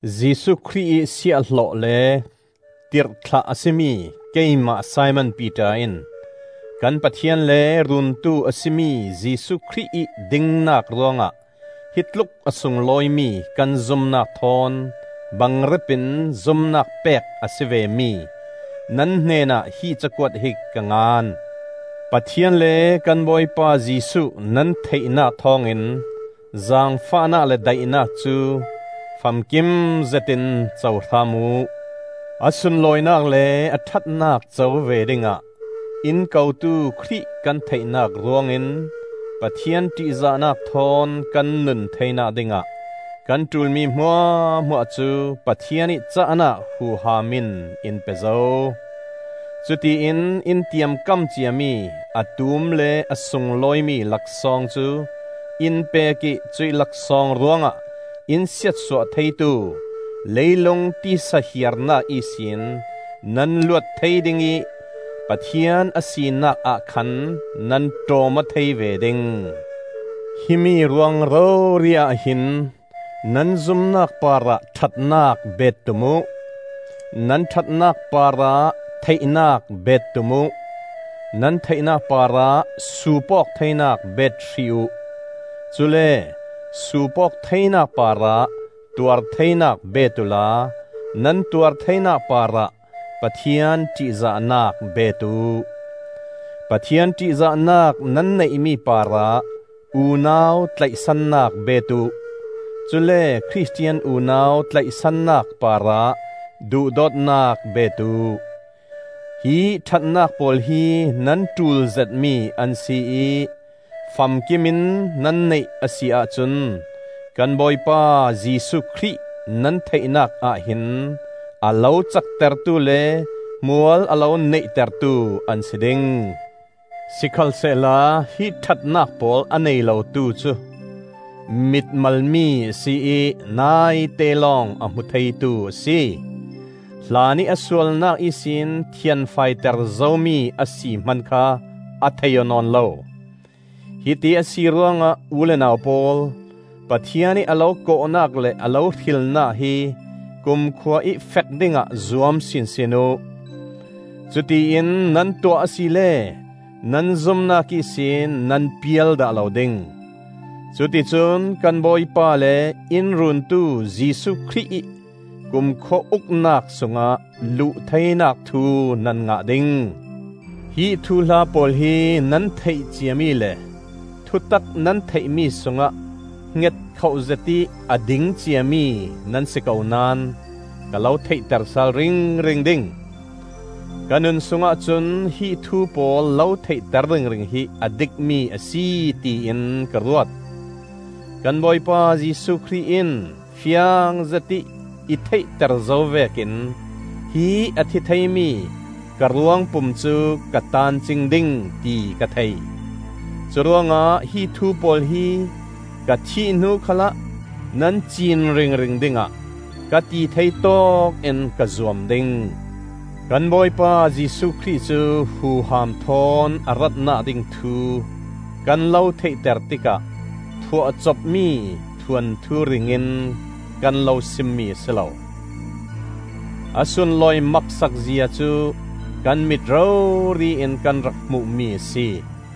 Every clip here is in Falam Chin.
Jesuh Khrih ih siahhlawh le tirhthlah a si mi keimah Simon Piter in kan Pathian le Runtu a si mi Jesuh Khrih ih dingnak ruangah hitluk a sunglawimi kan zumnak thawn bangrep in zumnak pek a si vemi nan hnenah hi cakuat hi ka ngan. Pathian le kan Bawipa Jesuh nan theihnak thawngin zaangfahnak le daihnak cu famkim zetin co hram uh. A sunlawinak le a ṭhatnak co ve dingah in kotu Khrih kan theihnak ruangin Pathian ṭihzahnak thawn kan nun theinak dingah kan ṭulmi hmuahhmuah cu Pathian ih cahnak huham in in pe zo. Cutiin in tiamkam ciami a tum le a sunglawimi laksawng cu in pek ih cuih laksawng ruangah in siatsuah theitu leilung tisa hiarnak ihsin nan luat thei ding ih Pathian a sinakah khan nan ṭawm aw thei ve ding. Himi ruang rori ahhin nan zumnak parah ṭhatnak bet tum uh; nan ṭhatnak parah theihnak bet tum uh; nan theihnak parah suup awk theinak bet hrih uh; cule suup awk theinak parah tuar theinak bet uhla nan tuar theinak parah Pathian ṭihzahnak bet uh. Pathian ṭihzahnak nan neihmi parah unau tlaihsannak bet uh; cule Khristian unau tlaihsannak parah duhdawtnak bet uh. Hi ṭhatnak pawl hi nan ṭul zetmi an si ih famkimin nan neih a si ahcun kan Bawipa Jesuh Khrih nan theihnak ah hin a lo caktertu le hmual a lo neihtertu an si ding. Sikhalsehla hi ṭhatnak pawl a nei lotu cu mitmalmi a si ih naite lawng a hmu theitu a si; hlanih a sualnak ihsin thianfaiter zomi a si hman kha a thei aw nawn lo. Hiti a si ruangah u le nau pawl, Pathian ih a lo kawhnak le a lo hrilnak hi kumkhua ih fek dingah zuam sinsin uh. Cutiin nan tuah asile nan zumnak ihsin nan pial dah lo ding. Cuticun kan Bawipa le in Runtu Jesuh Khrih ih kumkhua uknak sungah luh theinak thu nan ngah ding. Hi thuhla pawl hi nan theih ciami le thutak nan theihmi sungah hngetkhoh zetih a ding ciami nan si ko naón ka lo theihter sal ringring ding. Ka nun sungah cun hi thu pawl lo theihter ringring hi a dikmi a si tiin ka ruat. Kan Bawipa Jesuh Khrih in fiang zetih i theihter zo vekin hi a thi theimi ka ruangpum cu ka taan cing ding ti ka thei. Curuangah hi thu pawl hi ka thih hnu khalah nan ciin ringring dingah ka ti thei tawkin ka zuam ding. Kan Bawipa Jesuh Khrih cu huham thawn a ratnak ding thu kan lo theihter tikah phuahcopmi thuanthu ring in kan lo simmi a si lo. A sunlawi maksak zia cu kan mit rori in kan rak hmuhmi a si.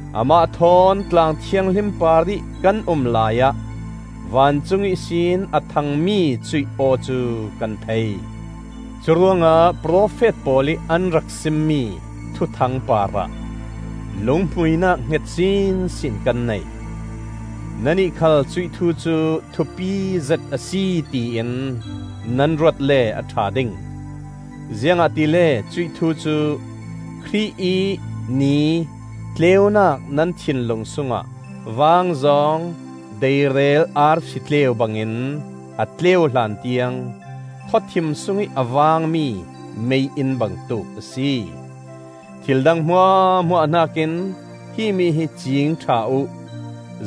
Amah thawn tlang thianghlim parih kan um laiah vancung ihsin a thangmi cuih aw cu kan thei. Curuangah profet pawl ih an rak simmi thuthang parah lunghmuinak hnget sinsin kan nei. Nannih khal cuih thu cu thupi zet a si tiin nan ruat le a ṭha ding; ziangahtile cuih thu cu Khrih ih Ni tleunak nan thinlung sungah vaangzawng deirel arsi tleu bangin a tleu hlan tiang khawthim sungih a vangmi mei-inn bangtuk a si. Thil dang hmuahhmuah hnakin himi hi ciing ṭha uh: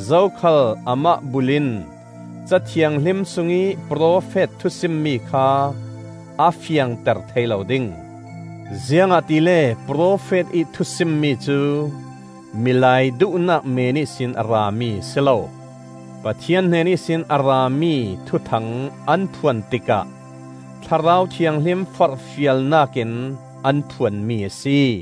zokhal amah bul in Ca Thianghlim sungih profet thusimmi kha a fiangter thei lo ding. Ziangahtile profet ih thusimmi cu milai duhnak meen ihsin a rami a si lo; Pathian hnen ihsin a rami thuthang an phuan tikah Thlarau Thianghlim forhfialnakin an phuanmi a si.